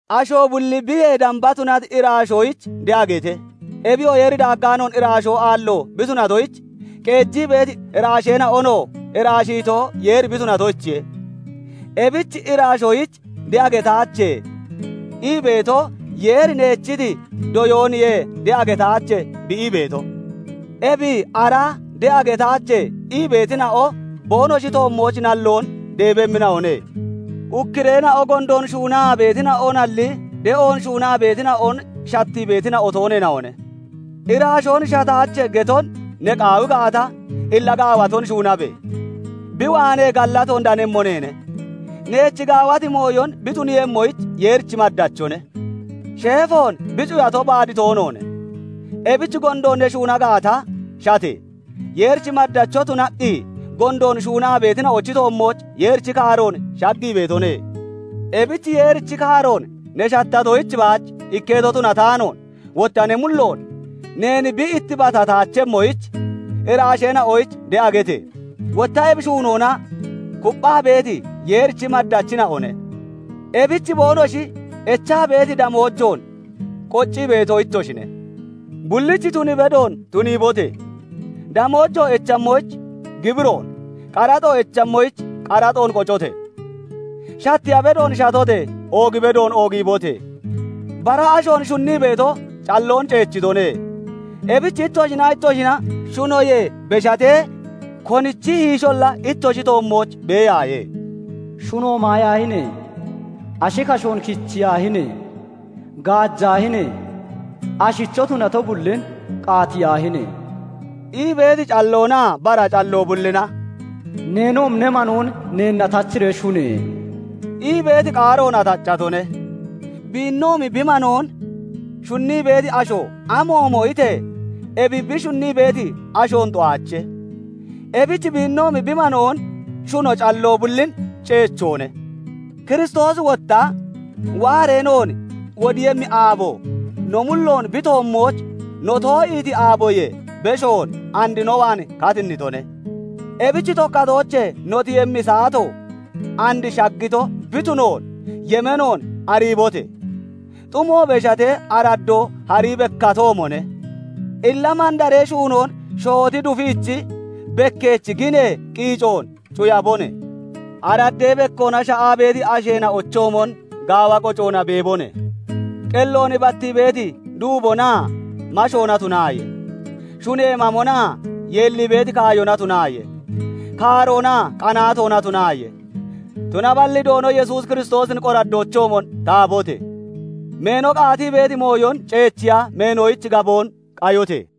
Asho bulli biyee damba tunati iraasheena'oyich de'a gete! Ebiyoo Yeeri daaggaanoon iraasho aallo bi tunatoyich, qeejii beeti iraasheena'onoo iraashiito Yeeri bi tunatoyichiye. Ebich iraashoyich "De'a getaache" ii beeto Yeeri neechiti doyooniye "De'a getaache" bi ii beeto; ebi ara "De'a getaache" ii beetina'o boonoshi toommooch nalloon deebemmina'one. Ukkureena'o gondoon shuunaa beetina'onalli, de'oon shuunaa beetina'on shattii beetina'o tooneena'one. "Iraashoon shataache" getoon ne qaawi gaata, illa gaawaton shuunabe! Bi waanee gallatoon danemmo neene; neech gaawati mooyon bi tuniiyemmoyich Yeerichi maddachone. Sheefoon bi cuyato baad toonoone; ebich gondoon ne shuuna gaata, shate! Yeerichi maddacho tunaqqi gondoon shuunaa beetina'ochi toommooch Yeerichi kaaroon shaggii beetone. Ebich Yeerichi kaaroon ne shattatoyich baach ikketo tunataanoon, wotta ne mullo neen bi ittibatataachemmoyich iraasheena'oyich de'a gete! Wotta ebi shuunoona kupphaa beeti, Yeerichi maddachina'one; ebich boonoshi echaa beeti damoojoon qoccii beeto ittoshine. Bullich tun bedoon tuniibote! Damoojo echammoyich gibiroon, qaraxo echahommich qaraxoon qocote! Shatteeya bedoon shatote! Oog bedoon oogiibote! Bara ashoon shunnii beeto calloon ceechitone; ebich ittoshinaa ittoshina shunoyee beshatee konichi hiisholla ittoshi toommooch beeyaaye. "Shunoon maayaahine! Ashi kashoon kichiyaahine! Gaajaahine! Ashicho tunato bullin qaatiyaahine!" ii beeti calloonaa bara calloo bullina "Neenoomi ne manoon neenna tachiree shune!" ii beeti qaaroona taccatone. Biinoomi bi manoon shunnii beeti asho amoomo itee ebi bi shunnii beeti ashoon xu'aache. Ebich biinoomi bi manoon shuno calloo bullin ceechoone. Kiristoosi wotta waaree noon wodiiyemmi aabo no mulloon bi toommooch no too'iiti aaboyee beshoon and no waan katinnitone. Ebich tokkatoochee no tiyemmi saato and shaggito bi tunoon yemeenoon ariibote! Xumo beshatee araddoo harii bekkatoomone. Illa mandaree shuunoon shooti dufiichi, bekkeechi ginee qiicoon cuyabone. Araddee bekkoona sha'aa beeti asheena'ochoomon gaawa qocoona beebone; qelloon battii beeti duubonaa mashoona tunaaye; shunee mamonaa yeellii beeti kaayona tunaaye; kaaroonaa qanaatoona tunaaye. Tunaballi Doono Yesuus Kiristoosin qoraddoochoomon tahabote! Meeno qaatii beeti mooyon ceechiya meenoyich gaboon qayote!